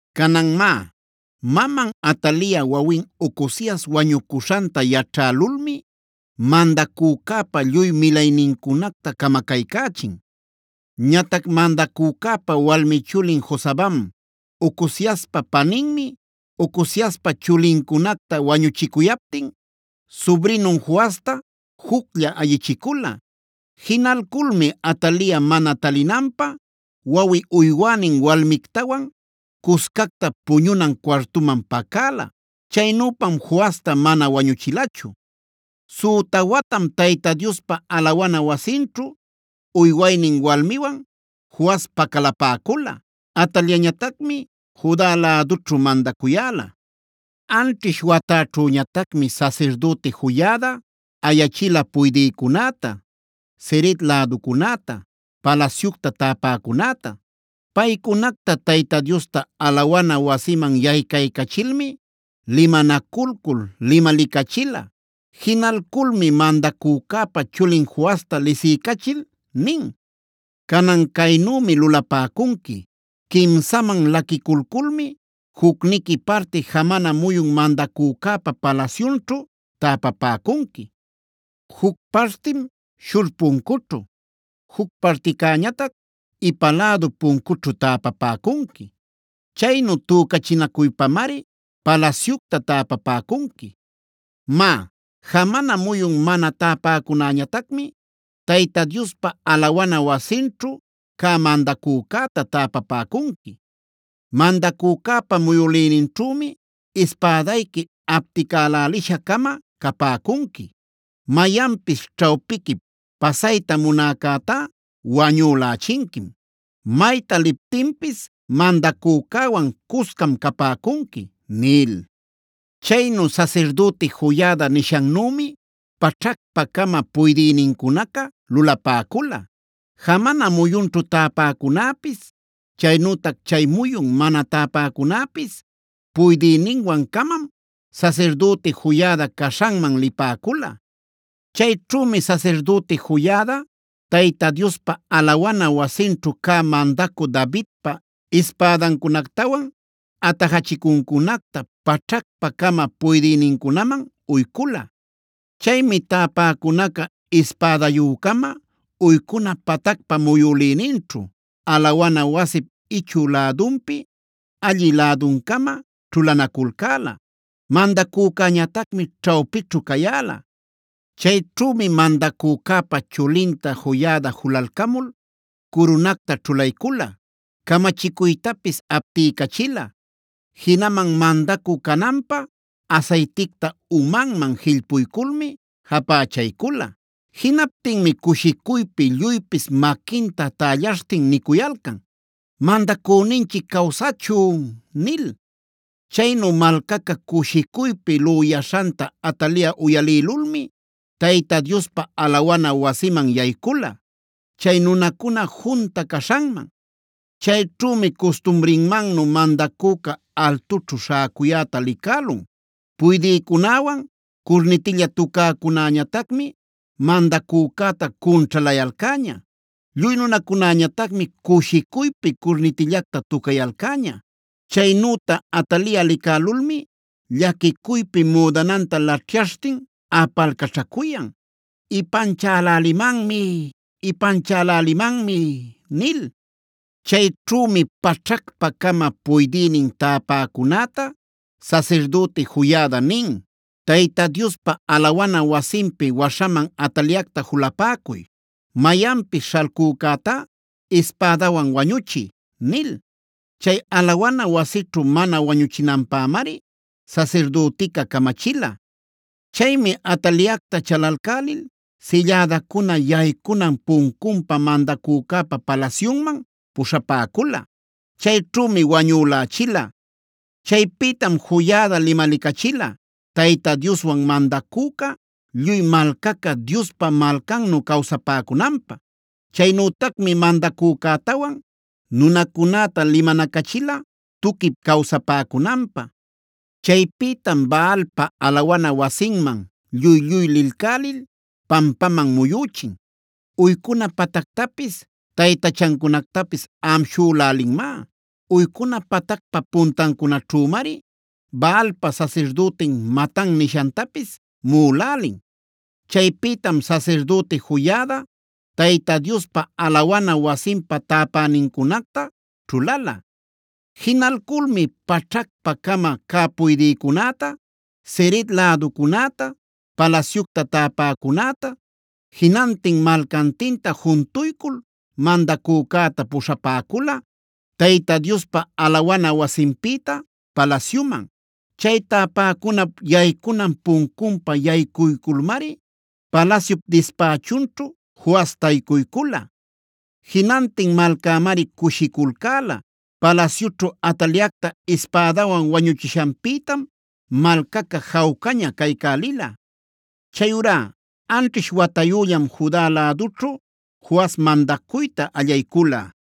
Canan má, maman Atalia wawin Ocozias wañucuśhanta yaćhälulmi mandacücäpa lluy milaynincunacta camacaycächin. Ñatac mandacücäpa walmi chulin Josabam, Ocoziaspa paninmi, Ocoziaspa chulincunacta wañuchicuyaptin subrinun Joasta juclla ayichicula. Jinalculmi Atalia mana talinanpä wawi uywänin walmictawan cuscacta puñunan cuartuman pacäla. Chaynüpam Joasta mana wañuchilachu. Süta watam Tayta Diospa alawana wasinćhu uywaynin walmiwan Joas pacalapäcula. Ataliañatacmi Juda lädućhu mandacuyäla. Anćhish watäćhüñatacmi sasirdüti Joiada ayachila puydïcunäta, Ceret läducunäta, palasyucta täpäcunäta. Paycunacta Tayta Diosta alawana wasiman yaycaycachilmi limanaculcul limalicachila. Jinalculmi mandacücäpa chulin Joasta lisiycachil nin: “Canan caynümi lulapäcunqui: quimsaman laquiculculmi jucniqui parti jamana muyun mandacücäpa palasyunćhu täpapäcunqui. Juc partim Shur puncućhu, juc particäñatac ipa lädu puncućhu täpapäcunqui. Chaynu tücachinacuypamari palasyucta täpapäcunqui. Má, jamana muyun mana täpäcunäñatacmi Tayta Diospa alawana wasinćhu cä mandacücäta täpapäcunqui. Mandacücäpa muyülïninćhümi ispädayqui apticälälisha-cama capäcunqui. Mayanpis ćhawpiquip pasayta munäcätá wañülächinquim. Mayta liptinpis mandacücäwan cuscam capäcunqui” nil. Chaynu sasirdüti Joiada nishannümi paćhacpa-cama puydïnincunaca lulapäcula. Jamana muyunćhu täpäcunäpis, chaynütac chay muyun mana täpäcunäpis puydïninwan-camam sasirdüti Joiada caśhanman lipäcula. Chayćhümi sasirdüti Joiada Tayta Diospa alawana wasinćhu cä mandacü Davidpa ispädancunactawan atajachicuncunacta paćhacpa-cama cä puydïnincunaman uycula. Chaymi täpäcunaca ispädayü-cama uycuna patacpa muyülïninćhu, alawana wasip ichü lädunpi allï läduncama ćhulanaculcäla; mandacücäñatacmi ćhawpićhu cayäla. Chayćhümi mandacücäpa chulinta Joiada julalcamul curunacta ćhulaycula, camachicuytapis aptiycachila. Jinaman mandacü cananpä asayticta umanman jillpuyculmi japächaycula. Jinaptinmi cushicuypi lluypis maquinta tällaśhtin nicuyalcan: “¡Mandacüninchic cawsachun!” nil. Chaynu malcaca cushicuypi lüyaśhanta Atalia uyalïlulmi Tayta Diospa alawana wasiman yaycula, chay nunacuna junta caśhanman. Chayćhümi custumrinmannu mandacüca altućhu śhäcuyäta licälun. Puydïcunäwan curnitilla tucäcunäñatacmi mandacücäta cunćhalayalcäña. Lluy nunacunäñatacmi cushicuypi curnitillacta tucayalcäña. Chaynüta Atalia licälulmi llaquicuypi müdananta laćhyaśhtin apalcaćhacuyan: “¡Ipanchälälimanmi! ¡Ipanchälälimanmi!” nil. Chayćhümi paćhacpa-cama puydïnin täpäcunäta sasirdüti Joiada nin: “Tayta Diospa alawana wasinpi waśhaman Ataliacta julapäcuy. Mayanpis śhalcücätá ispädawan wañuchiy” nil. Chay alawana wasićhu mana wañuchinanpämari sasirdütica camachila. Chaymi Ataliacta chalalcälil sillädacuna yaycunan puncunpa mandacücäpa palasyunman puśhapäcula. Chayćhümi wañülächila. Chaypïtam Joiada limalicachila Tayta Dioswan mandacüca, lluy malcaca Diospa malcannu cawsapäcunanpä. Chaynütacmi mandacücätawan nunacunäta limanacachila tuquip cawsapäcunanpä. Chaypïtam Baalpa alawana wasinman lluy-lluy lilcälil pampaman muyüchin. Uycuna patactapis, taytachancunactapis amshülälinmá. Uycuna patacpa puntancunaćhümari Baalpa sasirdütin Matan nishantapis muꞌulälin. Chaypïtam sasirdüti Joiada Tayta Diospa alawana wasinpa täpänincunacta ćhulala. Jinalculmi paćhacpa-cama cä puydïcunäta, Ceret läducunäta, palasyucta täpäcunäta, jinantin malcantinta juntuycul mandacücäta puśhapäcula Tayta Diospa alawana wasinpïta palasyuman. Chay täpäcunap yaycunan puncunpa yaycuyculmari palasyup dispächunćhu Joas taycuycula. Jinantin malcämari cushiculcäla. Palasyućhu Ataliacta ispädawan wañuchishanpïtam malcaca jawcaña caycälila. Chayurá anchiśh watayüllam Juda lädućhu Joas mandacuyta allaycula.